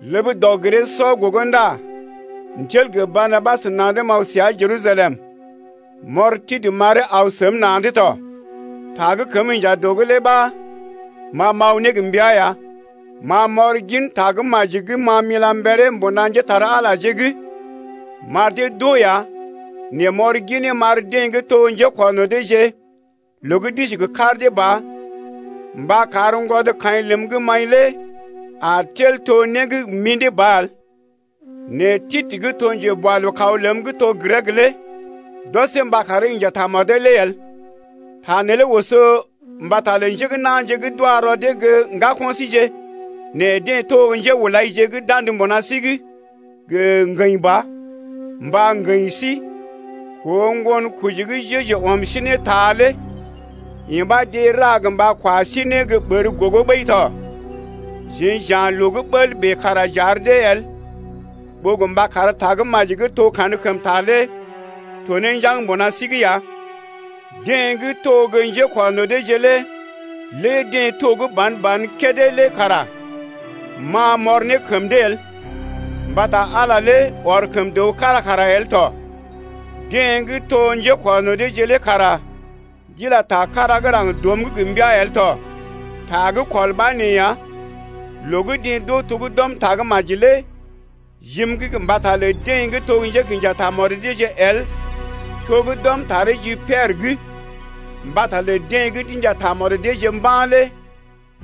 Ləb dɔg-giree-sɔ gogo ndá m’tel gə Barnabas na̰’d m’aw səa Jerusalem, m’ɔr Titə m’aree aw səm na̰’d tɔ. Ta gə́ kəm inja dɔ’g lé ɓa ma m’aw ne gə mbəa ya. Ma m’ɔr gin Tagə́maji gə́ ma m’ila mberee mbuna njépole-magəje’g m’ar dee d’oo ya nɛ m’ɔr ginee m’ar deḛ gə́ to gə́ njékɔrno̰ deeje loo gə́ d’isi gə kar dee ba gə mba kar ŋgwɔdkaḭ ləm gə́ m’aḭ lé a tel to né gə́ gə mḭdé ba el. Nɛ Titə gə́ to njeboalookaw ləm gə́ to Grek lé d’ɔsee mba karee inja tamɔdee lé el. Ta neelé oso mbata lə njé gə́ na̰je gə́ d’wa rɔ dee gə́ ŋgako̰ síje nɛ deḛ to gə́ njéhulaije gə́ d’andə mbuna sí’g gə ŋgəḭ ɓa, mba ŋgəḭ sí koo ŋgonkoji gə́ Jeju ɔm sí ne ta lé, yee ɓa deḛ ra gə mba kwa sí ne gə́ ɓər gogo ɓəi tɔ. Jeḛ j’ya̰ loo gə́ ɓəl bèe kára kara j’ar dee el ɓó gə mba kar Tagə́maji gə́ to kankəmta lé to ne njaŋg mbuna sí’g ya. Deḛ gə́ to gə́ njékɔrno̰ deeje lé lé deḛ to gə́ ban-ban kédé lé ma m’ɔr ne kəm dee el: mbata Ala lé ɔr kəm dəw kára kara el tɔ, deḛ gə́ to gə́ njékɔrno̰ deeje lé kara d’ila ta kára gə́ raŋg dɔm’g gə mbəa el tɔ. Ta gə́ kɔl ɓa nee ya: loo gə́ deḛ d’oo to gə́ d’ɔm Tagə́maji lé jim’g mbata lə deḛ gə́ to gə́ njékḭja tamɔd deeje el to gə́ d’ɔm taree ji Piɛrə’g mbata lə deḛ gə́ d’inja tamɔd deeje mba̰ lé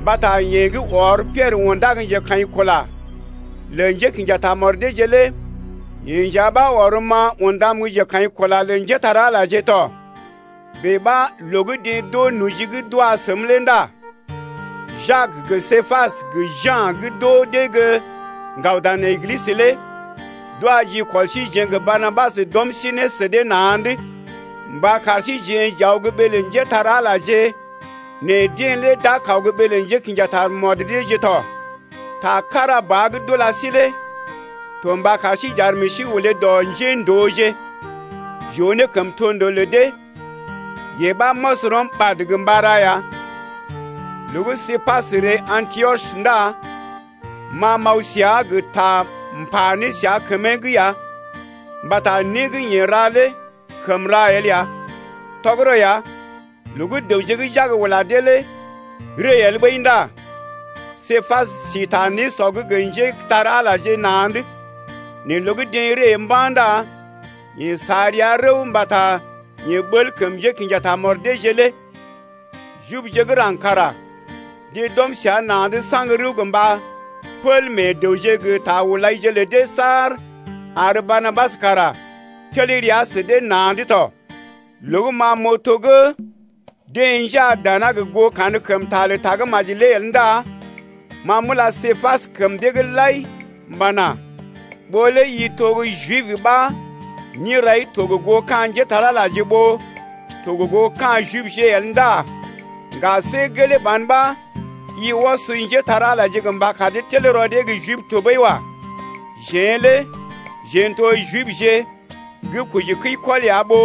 mbata yeḛ gə́ ɔr Piɛrə undá gə́ njekaḭkula lə njékḭja tamɔd deeje lé yeḛ nja ɓa ɔrm-ma undam gə́ njekaḭkula lə njépole-magəje tɔ. Bèe ɓa loo gə́ deḛ d’oo noji gə́ d’wa səm lé ndá Jak gə Képas gə Ja̰ d’oo dee gə́ ŋgaw dan Eglisə lé d’wa jikɔl síjeḛ gə Barnabas d’ɔm sí ne sə dee na̰’d mba kar síjeḛ j’aw gə́ ɓee lə njépole-magəje nɛ deḛ lé d’a kaw gə́ ɓee lə njékḭja tamɔd deeje tɔ. Ta kára ba gə́ d’ula sí lé to mba kar sí j’ar meḛ sí olé dɔ njéndooje’g j’oo ne kəmtondoo lə dee, yee ɓa m’ɔs rɔm ɓad gə mba ra ya. Loo gə́ Képas ree Antiɔs ndá ma m’aw səa gə ta m’pa ne səa kəmee’g ya mbata né gə́ yeḛ ra lé kəm ra el ya. Tɔgərɔ ya, loo gə́ dəwje gə́ Jak ula dee lé ree el ɓəi ndá Képas si ta nésɔ’g gə njépole-magəje na̰’d, nɛ loo gə́ deḛ ree mba̰ ndá yeḛ sa rəa rəw mbata yeḛ ɓəl kəm njékḭja tamɔd deeje lé. Jibje gə́ raŋg kara deḛ d’ɔm səa na̰’d saŋg rəw gə mba pəl meḛ dəwje gə ta hulaije lə dee saar ar Barnabas kara tel rəa sə dee na̰’d tɔ. Loo gə́ ma m’oo to gə́ deḛ njaa dana gə goo kankəmta lə Tagə́maji lé el ndá ma m’ula Képas kəm dee’g lai m’pana: Ɓó lé i to gə́ Jib ɓa nérai to gə goo ka̰ njépole-magəje ɓó to gə goo ka̰ Jibje el ndá ŋga, see gelee ban ɓa i ɔs njépole-magəje mba kar dee tel rɔ dee gə́ Jib tɔɓəi wa. Jeḛ lé jeḛ n’to Jibje gə́ kojikəikɔl ya ɓó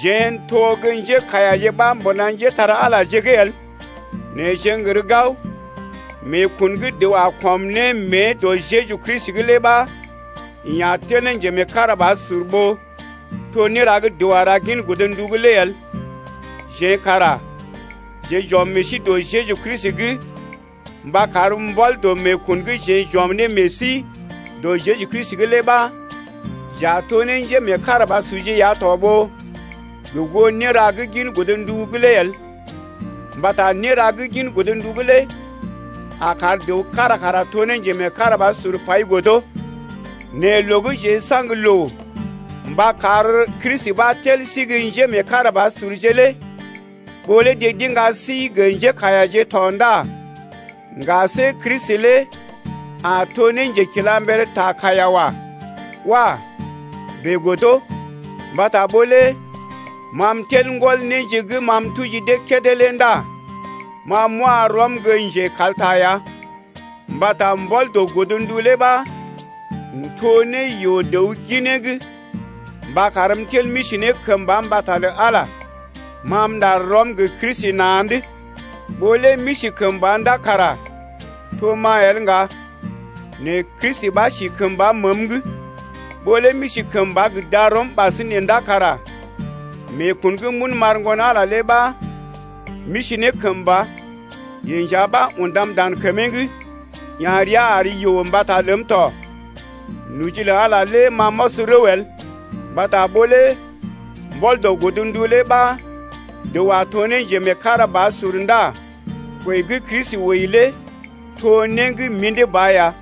jeḛ n’to gə́ njékaiyaje ɓa mbuna njépole-magəje’g el. Nɛ jeḛ n’gər gao, meekun gə́ dəw a kɔm ne mée dɔ Jeju Kristi’g lé ɓa yeḛ a tel ne njemeekarabasur ɓó to néra gə́ dəw a ra gin godndu’g lé el. Jeḛ kara jeḛ j’ɔm meḛ sí dɔ Jeju Kristi’g mba kar mbɔl dɔ meekun gə́ jeḛ j’ɔm ne meḛ sí dɔ gə Jeju Kristi’g lé ɓa j’a to ne njémeekarabasurje ya tɔ ɓó gə goo néra gə́ gin godndu lé el, mbata néra gə́ gin godndu’g lé a kar dəw kára kara to ne njemeekarabasur pai godo. Nɛ loo gə́ jeḛ n’saŋg loo mba kar Kristi ɓa tel sí gə́ njémeekarabasurje lé ɓó lé deḛ d’iŋga sí gə́ njékaiyaje tɔ ndá ŋga see Kristi lé a to ne njekilamber ta kaiya wa. Wah! bèe el. Mbata ɓó lé ma m’tel m’gɔl néje gə́ ma m’tuji dee kédé lé ndá ma m’wa rɔm gə́ njekalta ya, mbata mbɔl dɔ godndu lé ɓa m’to ne yoo-dəw ginee’g mba karm m’tel m’isi kəmba mbata lə Ala lé. Ma m’ɗar rɔm gə Kristi na̰’d, ɓó lé m’isi kəmba ndá kara to ma el ŋga, nɛ Kristi ɓa si kəmba məəm’g, ɓó lé m’isi kəmba gə darɔm ɓasinè ndá kara meekun gə́ m’un m’ar Ŋgon-Ala lé ɓa m’isi ne kəmba. Yeḛ nja ɓa undam dan kəmee’g, ya̰ rəa ar yoo mbata ləm tɔ. Noji lə Ala lé ma m’ɔs rəw el mbata ɓó lé mbɔl dɔ godndu lé ɓa dəw a to gə́ njemeekarabasur ndá kwəi gə́ Kristi wəi lé to né gə́ mḭdé ba ya.